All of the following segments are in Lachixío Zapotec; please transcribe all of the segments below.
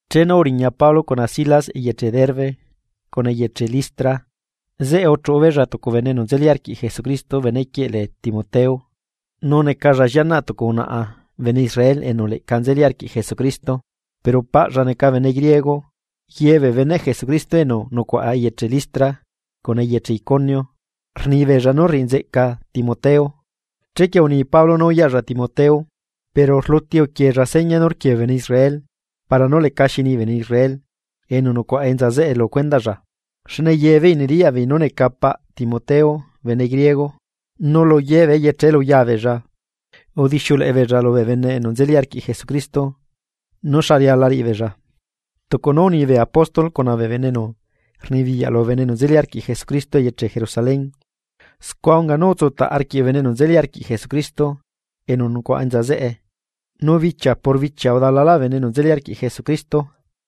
Chenu uriña Pablo cuna Silas eyeche Derbe cuna eyeche Listra, zeꞌe uchuꞌu beella tucu bene enu nzeli arquiꞌ Jesucristo, benequieꞌ lee Timoteo nu necalla llianaꞌ tucu unaꞌa bene Israel enu leꞌca nzeli arquiꞌ Jesucristo, pero paꞌlla neca bene griego. Ye bee beneꞌ Jesucristo enu nucuaꞌa eyeche Listra cuna eyeche Iconio rnibeella nu rriꞌi nzeꞌca Timoteo. Chequie uni Pablo nú uyaꞌlla Timoteo, pero rluti uquieella seña nú rquiee bee bene Israel para nú lecaxi nii bee bene Israel enu nucuaꞌa enza zeꞌe lu cuendaꞌlla, xne ye beei nediyaꞌ beei nú neca paꞌ Timoteo bene griego. Nu lu ye bee eyeche elu uyabeella, udixiuleꞌe beella lubee bene enu nzeli arquiꞌ Jesucristo nú xa riala riꞌi beella, tucu nú uni bee ápostol cuna bee bene enu rnibiyaꞌ lubee bene enu nzeli arquiꞌ Jesucristo eyeche Jerusalén. Scua unga nú utsutaꞌ arquiꞌ bee bene enu nzeli arquiꞌ Jesucristo enu nucuaꞌa enza zeꞌe, nu bichia por bichia udala bee bene enu nzeli arquiꞌ Jesucristo.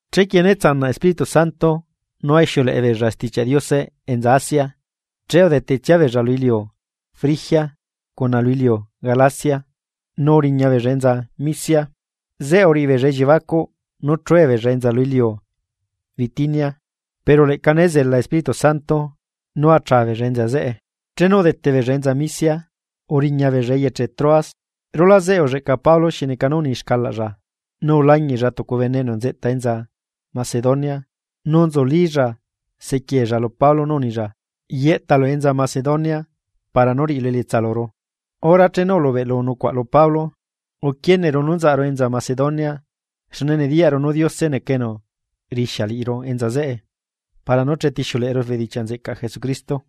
Chequie né tsanaꞌ Espíritu Santo nú a ixiuleꞌe beella Stichiaꞌ Diose enza Asia. Che udetetsia beella lu iliu Frigia cuna lu iliu Galacia, nu uriñabeella enza Misia. Zeꞌe uriꞌibeella elliebacuꞌ nú chue beella enza lu iliu Bitinia, pero leꞌca né zela Espíritu Santo nú a chaa beella enza zeꞌe. Chenu udete beella enza Misia, uriñabeella eyeche Troas. Rulaꞌ zeꞌe ulleꞌca Pablo xi neca nú uni xcalaꞌlla, nú ulañiꞌlla tucu bene enu nzeꞌta enza Macedonia nu nzulílla sequieella lu Pablo nú unilla: “Yeꞌtalu enza Macedonia para nú riꞌilu elietsa luru.” Hora chenu ulubeꞌlu nucuaꞌ lu Pablo, uquieneru nú nzaꞌaru enza Macedonia xne nediyaꞌru nú Diose neca enu rixia liꞌiru enza zeꞌe para nú chetixiuleꞌeru bedichiaꞌ nzeꞌcaꞌ Jesucristo.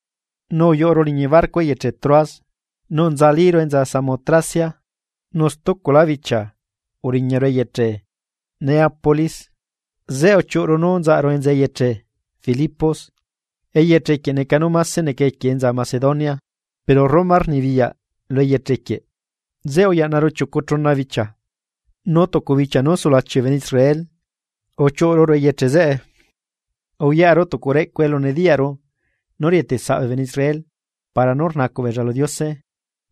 Nu uyuꞌru liñi barco eyeche Troas nu nzaꞌalíru enza Samotracia. Nu stuculá bichia uriñaru eyeche Neápolis. Zeꞌe uchiuꞌuru nu nzaꞌaru eyeche Filipos, eyeche quieꞌ neca nú máse neca equie enza Macedonia. Pero Roma rnibiyaꞌ lu eyeche quieꞌ, zeꞌe uyaꞌnaru chiucu chuna bichia. Nu tucu bichia nú sulachi bee bene Israel uchiuꞌuru ruꞌu eyeche zeꞌe, uyaꞌaru tucu reꞌcu elu nediyaꞌru nú rieteꞌsaꞌ bee bene Israel para nú rnacuꞌ beella lu Diose.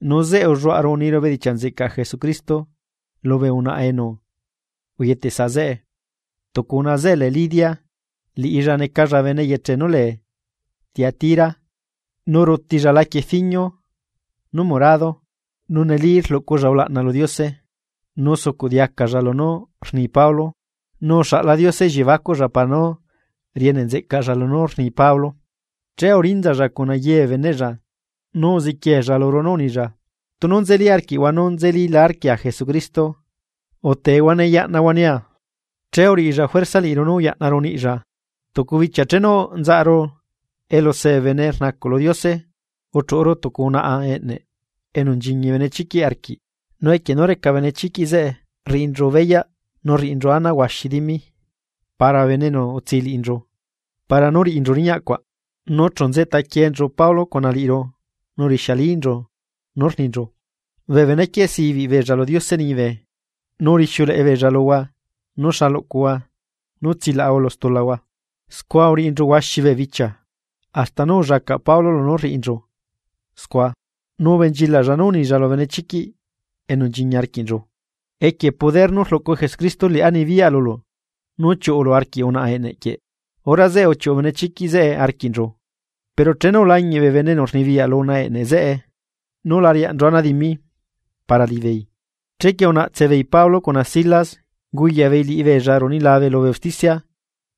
Nu zeꞌe ulluaꞌaru uniru bedichiaꞌ nzeꞌcaꞌ Jesucristo lubee unaꞌa enu uyetesaꞌ zeꞌe. Tucu unaꞌa zeꞌe lee Lidia, liꞌilla necalla bene eyeche nú lee Tiatira, nu rutilla laquie fiñu nú morado. Neli rluꞌculla ulaꞌna lu Diose nu sucuꞌ diacalla lunú rni Pablo, nu uxaꞌla Diose elliebacuꞌlla para nú rieneꞌ nzeꞌcaꞌlla lunú rni Pablo. Che urinzalla cuna ye bee beneꞌlla nu uziquieella luru nú unilla: ―Tunu nzeli arquiꞌhua nú nzelíla arquia Jesucristo uteehua ne yaꞌnahua nia. Che uriꞌilla juerza liꞌiru nú uyaꞌnaru niꞌlla. Tucu bichia chenu nzaꞌaru elu see bee bene rnacuꞌ lu Diose, uchuꞌuru tucu unaꞌa eꞌneꞌ enu nchiñi benechiquiꞌ arquiꞌ. Nu equie nú reca benechiquiꞌ zeꞌe rriꞌinchu beyaꞌ, nu rriꞌnchu ana huaxi dimi para bee bene enu utsii liꞌinchu para nú riꞌinchu riñaꞌ cuaꞌ. Nu chu nzeꞌta quienchu Pablo cuna liꞌiru nu rixialinchu nú rninchu: ―¡Bee benequieꞌ sibiꞌ beella lu Diose liñibe, nu rixiuleꞌe beella luhua nú xa luꞌcuhua nú tsilaꞌahua lu stulahua! Scua uriꞌinchu huaxi bee bichia, hasta nú ullacaꞌ Pablo lunú rriꞌinchu scua nu ubenchilaꞌlla nu unilla lu benechiquiꞌ enu nchiñi arquiꞌnchu: ―Equie poder nú rluꞌcu Jesucristo liꞌá nibiyaꞌa lulu nú chiuꞌulu arquiꞌ unaꞌa eꞌneꞌ quieꞌ. Hora zeꞌe uchiuꞌu benechiquiꞌ zeꞌe arquiꞌnchu. Pero chenu ulañiꞌ bee bene enu rnibiyaꞌ lu unaꞌa eꞌneꞌ zeꞌe nú la riaꞌnchu ana dimi para liꞌibeei, chequie unaꞌtse beei Pablo cuna Silas unguyaꞌbeei liꞌibeella ruꞌu nilabe lubee usticia.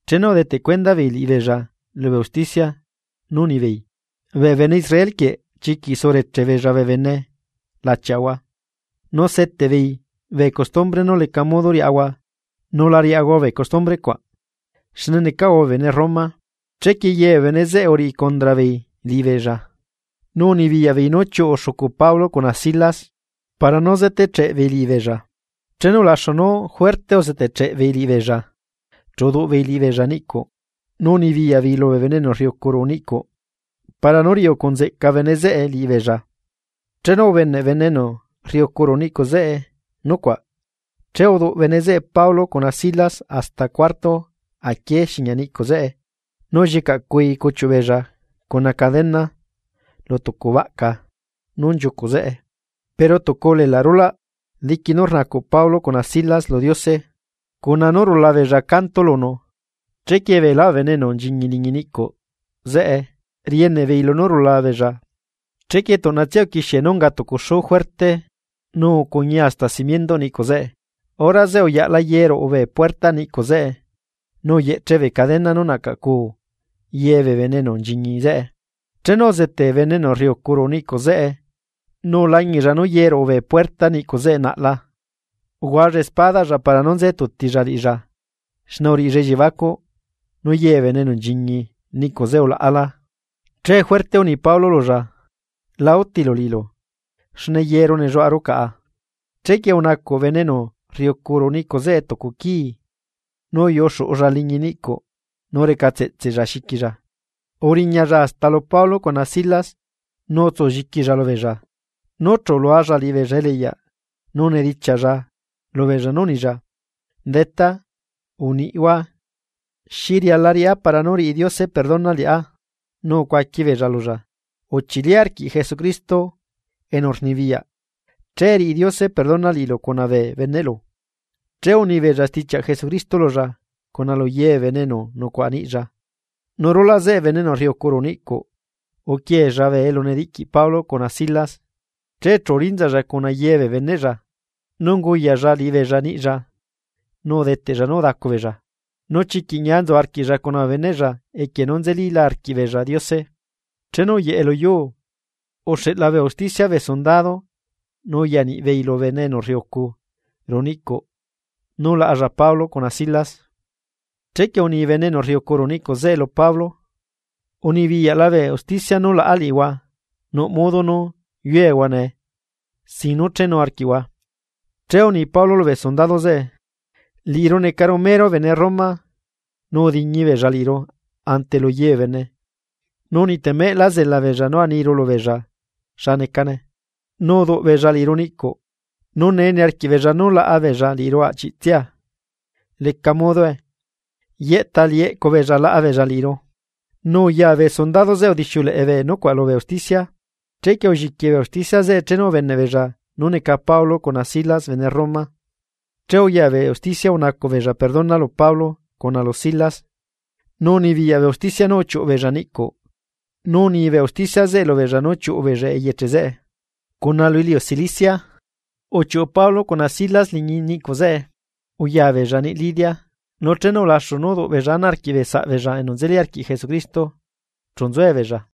Chenu udeteꞌ cuenda beei liꞌibeella lubee usticia unibeei: ―Bee bene Israel quieꞌ chiquiꞌ sureche beella bee bene lachiaꞌahua, nu seteꞌ beei bee custumbre nú leca modo riaꞌahua nu la riaꞌahua bee custumbre cuaꞌ, xne necaꞌahua bee bene Roma. Chequie ye bee bene zeꞌe uriꞌi condra beei liꞌibeella, nu unibiyaꞌ bee usticia nú chiuꞌu xucu Pablo cuna Silas para nú zeteꞌcheꞌ beei liꞌibeella. Chenu ulaxu nú juerte uzeteꞌcheꞌ beei liꞌibeella, chu uduꞌ beei liꞌibeella niꞌcuꞌ nu unibiyaꞌ beei lu bene enu rriucu ruꞌu niꞌcuꞌ para nú riꞌi ucu nzeꞌca bene zeꞌe liꞌibeella. Chenu ubeneꞌ bene enu rriucu ruꞌu niꞌcuꞌ zeꞌe nucuaꞌ, che uduꞌ bene zeꞌe Pablo cuna Silas hasta cuarto aquié xiñaꞌ niꞌcuꞌ zeꞌe nu ullicaꞌcui cuchiuꞌ beella cuna cadena lu tucu baꞌca nú nchiucuꞌ zeꞌe. Pero tucu ulelaꞌ rulaꞌ, diqui nú rnacuꞌ Pablo cuna Silas lu Diose cuna nú rula beella canto lunu. Chequie beelá bee bene enu nchiñi liñi niꞌcuꞌ zeꞌe rieneꞌ beei lunú rula beella. Chequie tuꞌnatsia uquixie nú unga tucu xú juerte nu ucuñi hasta simienduꞌ niꞌcuꞌ zeꞌe. Hora zeꞌe uyaꞌla ye ruꞌu bee puertaꞌ niꞌcuꞌ zeꞌe nu uyeꞌche bee cadena nú nacaꞌcuu ye bee bene enu nchiñi zeꞌe. Chenu uzetee bene enu rriucu ruꞌu niꞌcuꞌ zeꞌe ulañiꞌlla nú ye ruꞌu bee puerta niꞌcuꞌ zeꞌe naꞌla, che uhualla espadaꞌlla para nú nze utilla liꞌilla xne uriꞌilla elliebacuꞌ nú ye bee enu nchiñi niꞌcuꞌ ulaꞌala. Che juerte uni Pablo lulla: ―La útilu liꞌilu xne yeeru nelluaꞌaru caꞌa. Chequie unacuꞌ bene enu rriucu ruꞌu niꞌcuꞌ zeꞌe tucu quii nu uyuꞌu xuꞌulla liñi niꞌcuꞌ nu recatseꞌtseꞌlla xiquilla, uriñalla hasta lu Pablo cuna Silas nu utsulliquilla lubeella. Nu chu uhualla liꞌibeella eliꞌyaꞌ nu unidichiaꞌlla lubeella nú unilla: ―Detá uniꞌhua, ¿xi riala riaꞌa para nú riꞌi Diose perdona liꞌá? Nu ucuaqui beella lulla: ―Uchili arquiꞌ Jesucristo enu rnibiyaꞌ, che riꞌi Diose perdona liꞌilu cuna bee beneꞌlu. Che unibeella stichiaꞌ Jesucristo lulla cuna lu ye bee bene enu nucuaꞌa niꞌlla. Nu rulaꞌ zeꞌe bene enu rriucu ruꞌu niꞌcuꞌ, uquieella bee elu nediꞌquiꞌ Pablo cuna Silas. Che chu urinzalla cuna ye bee beneꞌlla. Nu unguyaꞌlla liꞌibeella niꞌlla nu udeteꞌlla nú udacu beella, nu chiquiꞌ ñia nzu arquiꞌlla cuna bee beneꞌlla equie nú nzelíla arquiꞌbeella Diose. Chenu uyeꞌe luyuu, uxeꞌla bee usticia bee sundado nú uyaniꞌbeei lu bene enu rriucu ruꞌu niꞌcuꞌ nú laꞌlla Pablo cuna Silas. Chequie uni bene enu rriucu ruꞌu niꞌcuꞌ zeꞌe lu Pablo: ―Unibiyaꞌla bee usticia nú laꞌa liꞌihua nuꞌ modo nú yuehua nee sin nú chenu arquiꞌhua. Che uni Pablo lubee sundado zeꞌe: ―Liꞌiru necaru mero bene Roma nu udiñi beella liꞌiru ante lu ye bee bene, nu niꞌtemeꞌ la zela beella nú aniru lubeella xa necane, nu uduꞌ beella liꞌiru niꞌcuꞌ. Nu nee niarquiꞌbeella nú laꞌa beella liꞌiru aꞌchiꞌtsia. ¡Leca modoe! Yeꞌta liꞌi eꞌcu beella laꞌa beella liꞌiru. Nu uya bee sundado zeꞌe udixiuleꞌe bee nucuaꞌ lubee usticia, chequie ulliqui bee usticia zeꞌe chenu ubeneꞌ beella nú neca Pablo cuna Silas bene Roma. Che uya bee usticia unacuꞌ beella perdona lu Pablo cuna lu Silas, nu unibiyaꞌ bee usticia nú uchiuꞌu beella niꞌcuꞌ nu uni bee usticia zeꞌe lubeella nú chiuꞌu beella eyeche zeꞌe. Chenu uchiuꞌu Pablo cuna Silas liñi niꞌcuꞌ zeꞌe uyabeella niꞌ Lidia. Nu chenu ulaxu nú uduꞌ beella ana arquiꞌ bee saꞌ beella enu nzeli arquiꞌ Jesucristo, chu nzuebeella.